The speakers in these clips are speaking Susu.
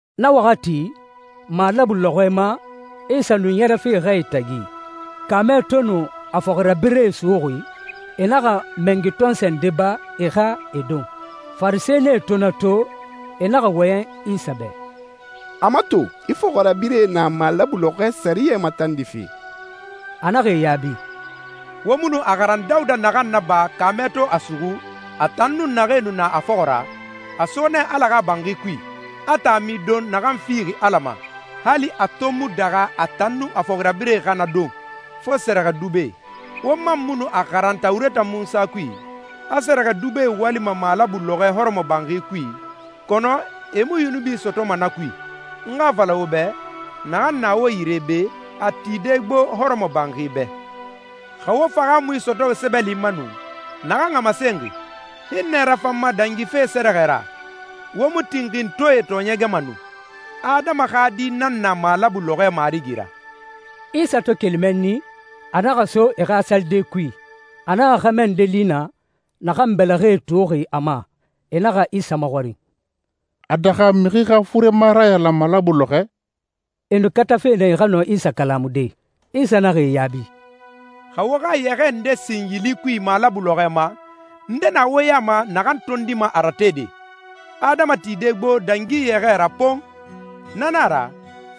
Na waxati, malabu lɔxɔɛ ma, Isa nu ɲɛrɛfe xɛe tagi. Kaamɛ to nu a fɔxirabirɛe suxuxi, e naxa mɛngi tɔnsɔɛ ndee ba, e xa e don. Farisɛnie to na to, e naxa wɔyɛn Isa bɛ, «A mato, i fɔxirabirɛe na malabu lɔxɔɛ sɛriyɛ matandife.» A naxa e yaabi, «Wo mu nu a xaran Dawuda naxan naba kaamɛ to a suxu, a tan nun naxee nu na a fɔxɔ ra? A so nɛ Ala xa banxi kui, a taami don naxan fixi Ala ma, hali a to mu daxa a tan nun a fɔxirabirɛe xa na don, fo sɛrɛxɛdubɛe. Wo man mu nu a xaran Tawureta Munsa kui, a sɛrɛxɛdubɛe walima malabu lɔxɔɛ hɔrɔmɔbanxi kui, kɔnɔ e mu yunubi sɔtɔma na kui? N xa a fala wo bɛ, naxan na wo yire be, a tide gbo hɔrɔmɔbanxi bɛ. Xa wo fahaamui sɔtɔxi sɛbɛli ma nu, naxan a masenxi, ‹Hinnɛ rafan n ma dangife sɛrɛxɛ ra,› wo mu tinxintɔɛe tɔɔɲɛgɛma nu. Adama xa Di nan na malabu lɔxɔɛ marigi ra.» Isa to keli mɛnni, a naxa so e xa salide kui. A naxa xɛmɛ nde li naa, naxan bɛlɛxɛ tuuxi a ma. E naxa Isa maxɔrin, «A daxa mixi xa furema rayalan malabu lɔxɔɛ?» E nu katafe nɛ e xa nɔ Isa kalamude. Isa naxa e yaabi, «Xa wo xa yɛxɛɛ nde sin yili kui malabu lɔxɔɛ ma, nde na wo ya ma naxan tondima a ratede? Adama tide gbo dangi yɛxɛɛ ra pon! Na nan a ra,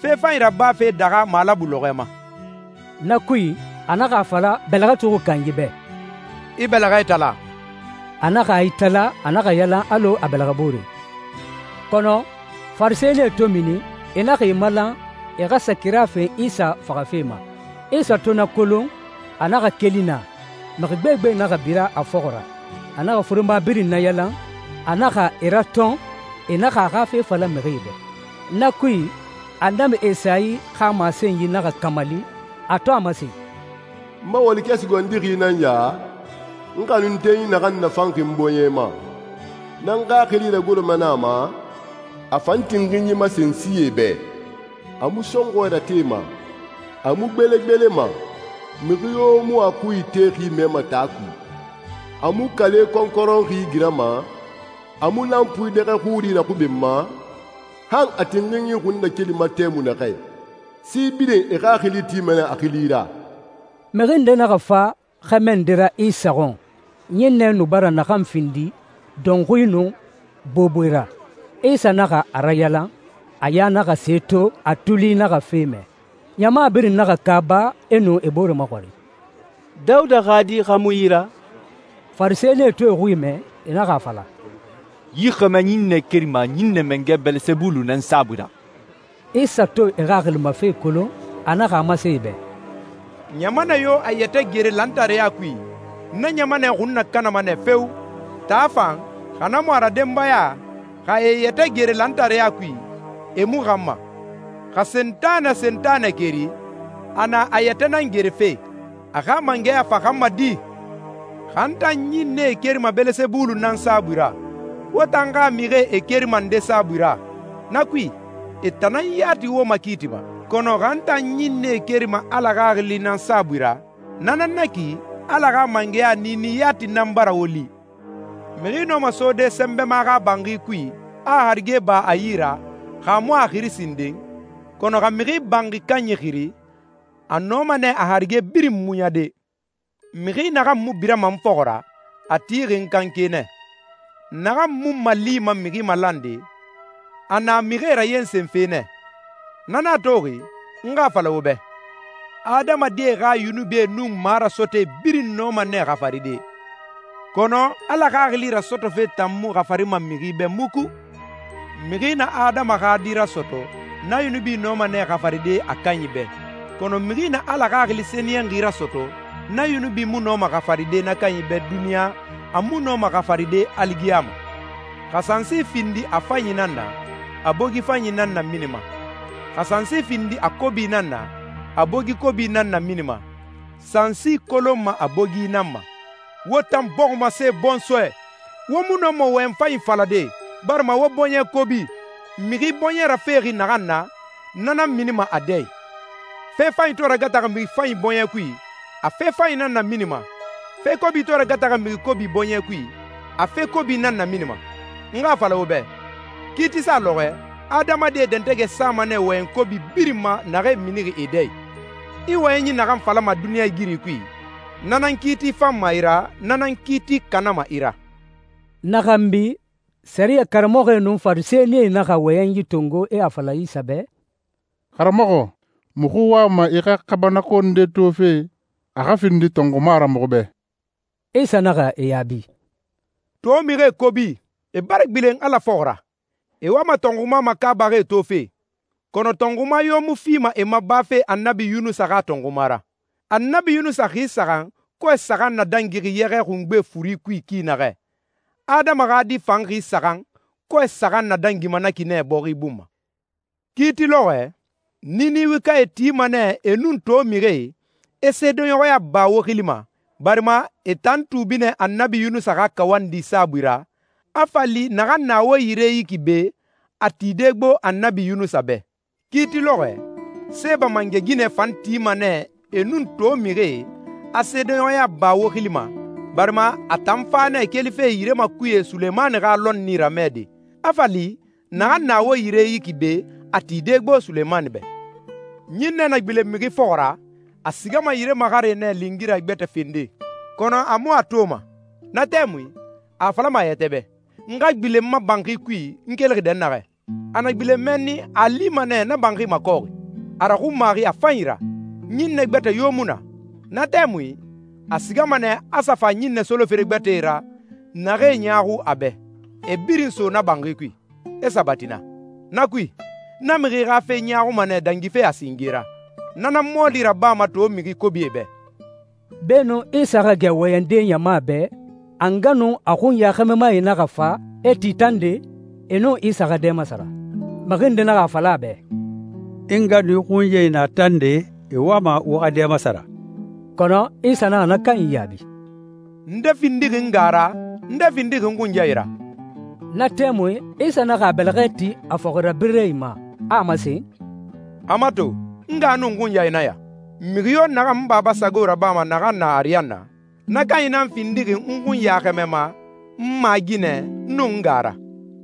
fe fanyi rabafe daxa malabu lɔxɔɛ ma.» Na kui, a naxa a fala bɛlɛxɛ tuuxi kanyi bɛ, «I bɛlɛxɛ itala.» A naxa a itala, a naxa yalan alɔ a bɛlɛxɛ boore. Kɔnɔ Farisɛnie to mini, e naxa e malan, e xa sa kira fen Isa faxafe ma. Isa to na kolon, a naxa keli naa. Mixi gbegbe naxa bira a fɔxɔ ra. A naxa furema birin nayalan, a naxa e ratɔn e naxa a xa fe fala mixie bɛ. Na kui, Annabi Esayi xa masenyi naxa kamali, a to a masen, «N ma walikɛ sugandixi nan ya, n xanuntenyi naxan nafanxi n bɔɲɛ ma. N nan n Xaxili ragoroma nɛ a ma, a fan tinxinyi masen sie bɛ. A mu sɔnxɔɛ ratema, a mu gbelegbelema, mixi yo mu a xui itexi mɛma taa kui. A mu kale kɔnkɔrɔnxi girama, a mu lanpui dɛxɛ xuri raxubenma, han a tinxinyi xunnakelima tɛmui naxɛ. Si birin e xaxili tima nɛ a xili ra.» Mixi nde naxa fa xɛmɛ nde ra Isa xɔn ɲinnɛ nu bara naxan findi dɔnxui nun boboe ra. Isa naxa a rayalan, a ya naxa se to, a tuli naxa fe mɛ. Ɲama birin naxa kaaba, e nu e bore maxɔrin, «Dawuda xa Di xa mu yi ra?» Farisɛnie to e xui mɛ, e naxa a fala, «Yi xɛmɛ ɲinnɛ kerima ɲinnɛ mangɛ Bɛlɛsɛbulu nan saabui ra.» Isa to e xaxili ma fe kolon, a naxa a masen e bɛ, «Ɲamanɛ yo a yɛtɛ gere lantareya kui, na ɲamanɛ xun nakanama nɛ feo! Taa fan, xa na mu a ra denbaya, xa e e yɛtɛ gere lantareya kui, e mu xanma. Xa Sentanɛ Sentanɛ keri, a na a yɛtɛ nan gerefe. A xa mangɛya fa xanma di? Xa n tan ɲinnɛe kerima Bɛlɛsɛbulu nan saabui ra, wo tan xa mixie e kerima nde saabui ra? Na kui e tan nan yati wo makiitima. Kɔnɔ xa n tan ɲinnɛe kerima Ala Xaxili nan saabui ra, na nan na ki Ala xa mangɛya niini yati nan bara wo li. Mixi nɔma sode sɛnbɛma xa banxi kui, a a harige ba a yi ra, xa a mu a xiri sinden? Kɔnɔ xa mixi banxi kanyi xiri, a nɔma nɛ a harige birin muɲade.» «Mixi naxan mu birama n fɔxɔ ra, a tixi n kanke nɛ. Naxan mu n malima mixi malande, a na mixie rayensenfe nɛ. Na nan a toxi, n xa a fala wo bɛ, adamadie xa yunubie nun marasɔtɔɛe birin nɔma nɛ xafaride, kɔnɔ Ala Xaxili rasɔtɔfe tan mu xafarima mixi bɛ muku. Mixi na Adama xa Di rasɔtɔ, na yunubi nɔma nɛ xafaride a kanyi bɛ. Kɔnɔ mixi na Ala Xaxili Sɛniyɛnxi rasɔtɔ, na yunubi mu nɔma xafaride na kanyi bɛ duniɲa, a mu nɔma xafaride aligiyama.» «Xa sansi findi a fanyi nan na, a bogi fanyi nan naminima. Xa sansi findi a kobi nan na, a bogi kobi nan naminima. Sansi kolonma a bogi nan ma. Wo tan bɔximase bɔnsɔɛ, wo mu nɔma wɔyɛn fanyi falade, barima wo bɔɲɛ kobi. Mixi bɔɲɛ rafexi naxan na, na nan minima a dɛ i. Fe fanyi to ragataxi mixi fanyi bɔɲɛ kui, a fe fanyi nan naminima. Fe kobi to ragataxi mixi kobi bɔɲɛ kui, a fe kobi nan naminima. N xa a fala wo bɛ, kiitisa lɔxɔɛ, adamadie dɛntɛgɛ sama nɛ wɔyɛn kobi birin ma naxee mini e dɛ i. I wɔyɛnyi naxan falama duniɲɛigiri kui, na nan kiiti fanma i ra, na nan kiiti kanama i ra.» Na xanbi, sɛriyɛ karamɔxɔe nun Farisɛnie naxa wɔyɛnyi tongo, e a fala Isa bɛ, «Karamɔxɔ, muxu wama i xa kaabanako nde tofe, a xa findi tɔnxuma ra muxu bɛ.» Isa naxa e yaabi, «To mixie kobi, e bara gbilen Ala fɔxɔ ra. E wama tɔnxuma makaabaxi tofe, kɔnɔ tɔnxuma yo mu fima e ma bafe Annabi Yunusa xa tɔnxuma ra. Annabi Yunusa xi saxan, kɔɛ saxan nadangi yɛxɛ xungbe furi kui ki naxɛ, Adama xa Di fan xi saxan, kɔɛ saxan nadangima na ki nɛ bɔxi bun ma. Kiiti lɔxɔɛ, Ninewekae tima nɛ e nun to mixie, e seedeɲɔxɔya ba wo xili ma, barima e tan tuubi nɛ Annabi Yunusa xa kawandi saabui ra, a fa li naxan na wo yire yi ki be, a tide gbo Annabi Yunusa bɛ. Kiiti lɔxɔɛ, Seeba mangɛ ginɛ fan tima nɛ e nun to mixie, a seedeɲɔxɔya ba wo xili ma, barima a tan fa nɛ kelife yire makuye Sulemani xa lɔnni ramɛde, a fa li naxan na wo yire yi ki be, a tide gbo Sulemani bɛ.» «Ɲinnɛ na gbilen mixi fɔxɔ ra, a sigama yire maxare nɛ lingira gbɛtɛ fende, kɔnɔ a mu a toma. Na tɛmui a a falama a yɛtɛ bɛ, ‹N xa gbilen n ma banxi kui n kelixi dɛnnaxɛ.› A na gbilen mɛnni a a lima nɛ na banxi makɔxi, a raxunmaxi a fanyi ra, ɲinnɛ gbɛtɛ yo mu na. Na tɛmui, a sigama nɛ a sa fa ɲinnɛ solofere gbɛtɛe ra naxee ɲaaxu a bɛ, e birin so na banxi kui, e sabati naa. Na kui, na mixi xa fe ɲaaxuma nɛ dangife a singe ra. Na nan mɔɔli rabama to mixi kobie bɛ.» Beenun Isa xa gɛ wɔyɛnde ɲama bɛ, a nga nun a xunya xɛmɛmae naxa fa, e ti tande, e nun Isa xa dɛ masara. Mixi nde naxa a fala a bɛ, «I nga nun i xunyae na tande, e wama wo xa dɛ masara.» Kɔnɔ Isa naxa na kanyi yaabi, «Nde findixi nga ra? Nde findixi n xunyae ra?» Na tɛmui Isa naxa a bɛlɛxɛ ti a fɔxirabirɛe ma, a a masen, «A mato, n nga nun n xunyae nan ya. Mixi yo naxan n Baba sago rabama naxan na ariyanna, na kanyi nan findixi n xunya xɛmɛma, n maaginɛ, nun n nga ra.»